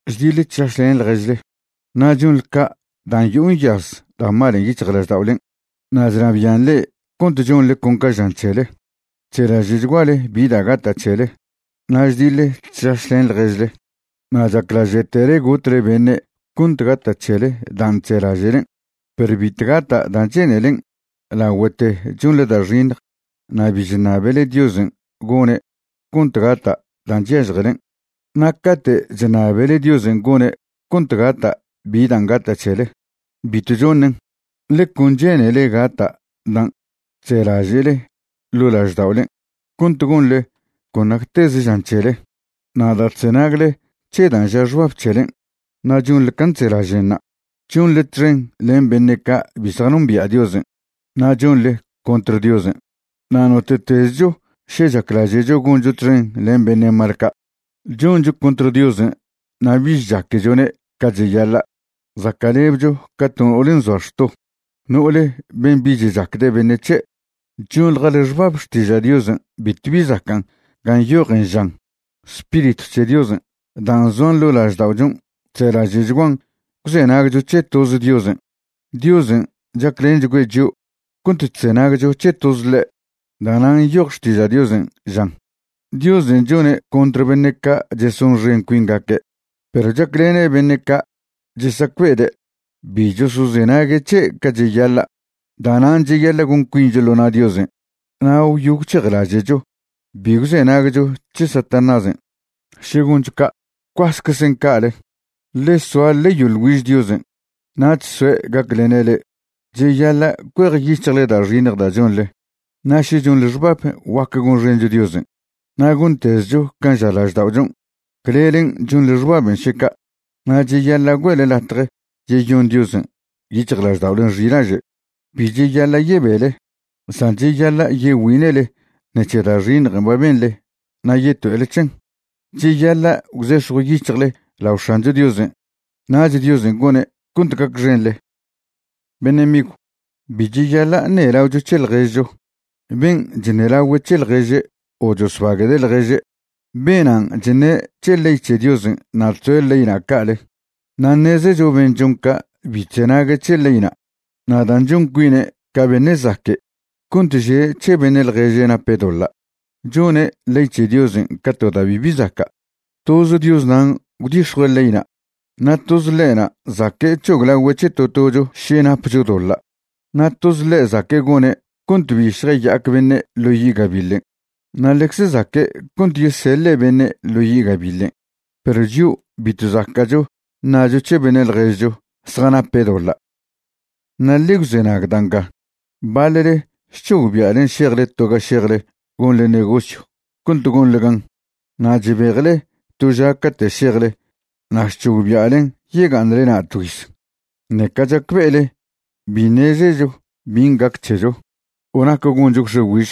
Chdiḻe chšašlen ḻježle, na' chonḻe ca' dan' yo'o nyaz da' malen' yic̱hjlažda'olen' na' chnabian' le'e cont chonḻe con ca žan c̱hele. Chzelaže'chguale bi da' gata' c̱hele na' chdiḻe chšašlen ḻježle na' chaclaže'tele gotle beṉe' cont gata' c̱hele dan' chzelaže'len'. Perw bitw gata' dan' che'nelen' lagüete chonḻe da' xiṉj na' bi chṉabele Diosen' gone' cont gata' dan' chyažjelen'. Na' cate' chṉabele Diosen' gone' cont gata' bi dan' gata' c̱hele, bitw choṉen', ḻe con che'nele gata' dan' chzelaže'le ḻo' lažda'olen' cont gonḻe con nacteze žan c̱hele. Na' da' chzenagle c̱he dan' ža xbab c̱helen' na' chonḻe can' chzelažen'ṉa', chonḻe txen len beṉe' ca' bi zjanombia' Diosen', na' chonḻe contr Diosen'. Na' note'tezcho še chaclaže'cho goncho txen len beṉe' mal ca', choncho contr Diosen' na' bich chaquechone' ca cheyaḻa'. Zaca'lebcho ca to no'ole nzoa xto, no'ole ben' bich chacde' beṉe' c̱he'. Chonḻjale xbab Xtiža' Diosen' bitw bi zacan' gan' nyojen žan: “Spiritw c̱he Diosen' dan' zoan ḻo' lažda'ochon' chzelaže'chguan gwzenagcho c̱he toz Diosen'.” Diosen' chaclenchgüe' chio' cont chzenagcho c̱he toz ḻe'. Da'nan' nyoj Xtiža' Diosen' žan: “Diosen' chone' contr beṉe' ca' chesonxen cuingaque', perw chaclene' beṉe' ca' chesacbe'ede' bi chosozenague' c̱he' ca cheyaḻa'.” Da'nan' cheyaḻa' gon cuincho ḻo na' Diosen' na' gwyo gwc̱hejlaže'cho bi gwzenagcho c̱he Satanásen'. Še goncho ca', gwcuaseczen ca'ale. Ḻe soa ḻe yoḻ güiž Diosen', nach soe' gaclene' le'e. Cheyaḻa' cuejyic̱hjle da' xiṉj da' chonḻe. Na' še chonḻe xbab guac gonxencho Diosen' na' gontezcho can' ža lažda'ochon', clelen' chonḻe xbaben' še ca', na' cheyaḻa' güe'le latje yeyon Diosen' yic̱hjlažda'olen' xilaže'. Bi cheyaḻa' yebele, san cheyaḻa' yegüine'le ṉec̱he da' xiṉjen' ba benḻen' na' yeto'ele c̱hen. Cheyaḻa' gwzex̱jw yic̱hjle lao X̱ancho Diosen', nach Diosen' gone' cont gacxenḻe. Beṉe' migw, bi cheyaḻa' ṉelaocho c̱he ḻježcho. Ben' chṉelagüe' c̱he ḻježe' o chosbaguede' ḻježe', benan' chṉe' c̱he ley c̱he Diosen' na' chzoe' leyna' ca'ale. Na' ṉezecho ben' chon ca' bi chzenague' c̱he leyna'. Na' dan' chon cuine' ca beṉe' zaque' cont že' c̱he beṉe' ḻježe' nape' doḻa', chone' ley c̱he Diosen' ca to da' bibi zaca'. Toz Dios nan' gwdix̱jue' leyna', na' toz ḻe'na' zaque' c̱hoglagüe' c̱he to tocho še napcho doḻa'. Na' toz ḻe' zaque' gone' cont bi šjaya'ac beṉe' ḻo yi' gabiḻen', na' ḻecze zaque' cont yeseḻe' beṉe' ḻo yi' gabiḻen'. Perw chio' bitw zaca'cho ṉacho c̱he beṉe' ḻježcho zjanape' doḻa'. Na' ḻe gwzenag da' nga: Baḻle chc̱hogbia'len šejle to ga šejle gonḻe negosyw cont gonḻe gan. Na' chbejle to ža cate' šejle na' chc̱hogbia'len yega'aṉle na' tgüiz, ṉeca chacbe'ele bi ṉezecho bin' gac c̱hecho o nac goncho gwx̱e güižj.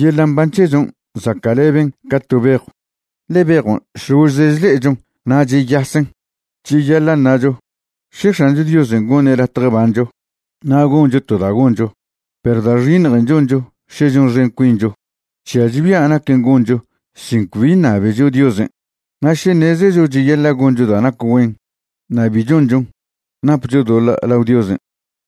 Yeḻa' mban c̱hechon' zaca'leben ca to bejw, ḻe bejon' šložze chle'echon na' cheyasen. Cheyaḻa' ṉacho: “Še X̱ancho Diosen' goṉe' latje bancho, na' goncho to da' goncho.” Perw da' xiṉjen' choncho še chonxen cuincho chžiacho bia' naquen' goncho sin cbi ṉabecho Diosen'. Na' še ṉezecho cheyaḻa' goncho da' nac güen na' bi chonchon, napcho doḻa' lao Diosen'.